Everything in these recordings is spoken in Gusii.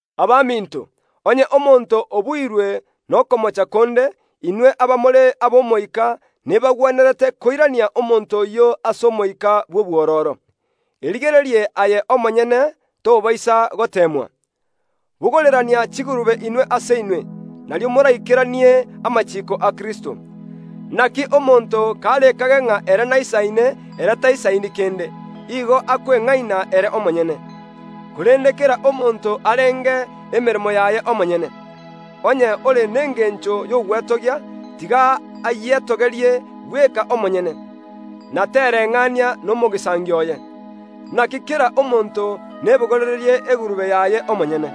Abaminto, onye omonto obuirwe nokomocha konde, inwe abamore ab’Omoika nebagwenerete koirania omonto oyio ase omoika bw’obwororo. Erigererie aye omonyene, tobaisa goteemwa. Bogorerania chigurube inwe ase inwe, nario moraikeranie amachiiko a Kristo. Naki omonto karekage ng’a ere naisaine, ere taisaini kende; igo akweng’aina ere omonyene. Korende kera omonto arenge emeremo yaye omonyene. Onye ore nengencho y’ogwetogia, tiga ayietogerie bweka omonyene, na tereng’ania nomogisangio oye. Naki kera omonto nebogorererie egurube yaye omonyene.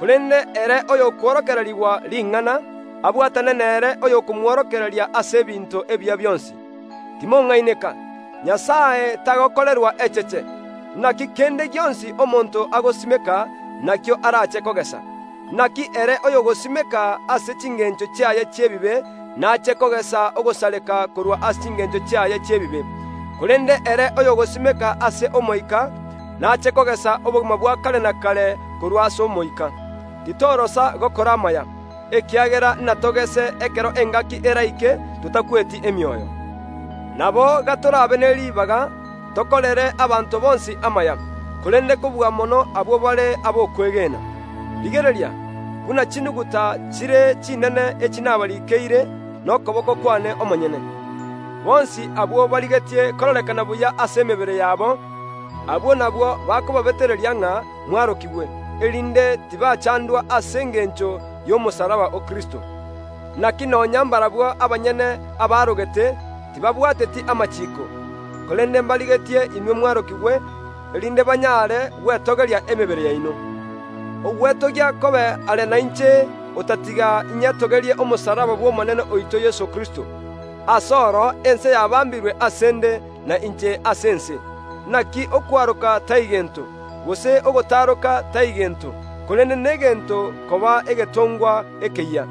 Korende ere oyokworokererigwa ring’ana, abwatane nere oyokomworokereria ase ebinto ebiya bionsi. Timong’aineka; Nyasae tagokorerwa echeche. Naki kende gionsi omonto agosimeka, nakio arache kogesa. Naki ere oyogosimeka ase chingencho chiaye chi’ebibe nache kogesa ogosareka korwa ase chingencho chiaye chi’ebibe, korende ere oyogosimeka ase Omoika nache kogesa obogima bwa kare na kare korwa ase Omoika. Titorosa gokora amaya, ekiagera natogese ekero engaki eraike, totakweti emioyo. Nabo gatorabe ne ribaga tokorere abanto bonsi amaya, korende kobua mono abwo bare ab’okwegena. Rigereria, buna chinuguta chire chinene echi nabariikeire nokoboko kwane omonyene. Bonsi abwo barigetie kororekana buya ase emebere yabo, abwo nabwo bakobabetereria ng’a mwarokigwe, erinde tibachandwa ase engencho y’omosalaba o Kristo. Naki nonya mbarabwo abanyene abaarogete tibabwateti amachiiko, korende mbarigetie inwe mwarokigwe, erinde banyare gwetogeria emebere yaino. Ogwetogia kobe are nainche, otatiga inyetogerie omosalaba Omonene oito Yeso Kristo, ase oro ense yabambirwe ase ’nde, na inche ase ense. Naki okwaroka tai gento, gose ogotaroka tai gento, korende negento koba egetongwa ekeyia.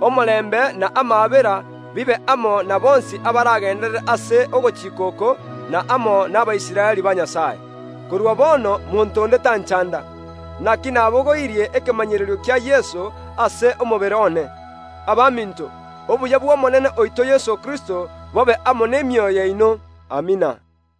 Omorembe na amaabera bibe amo na bonsi abaragenderere ase ogochika oko, na amo n’Abaisraeli ba Nyasae. Korwa bono monto onde tanchanda; naki nabogoirie ekemanyererio kia Yeso ase omobere one. Abaminto, obuya bw’omonene oito Yeso Kristo bobe amo nemioyo yaino. Amina.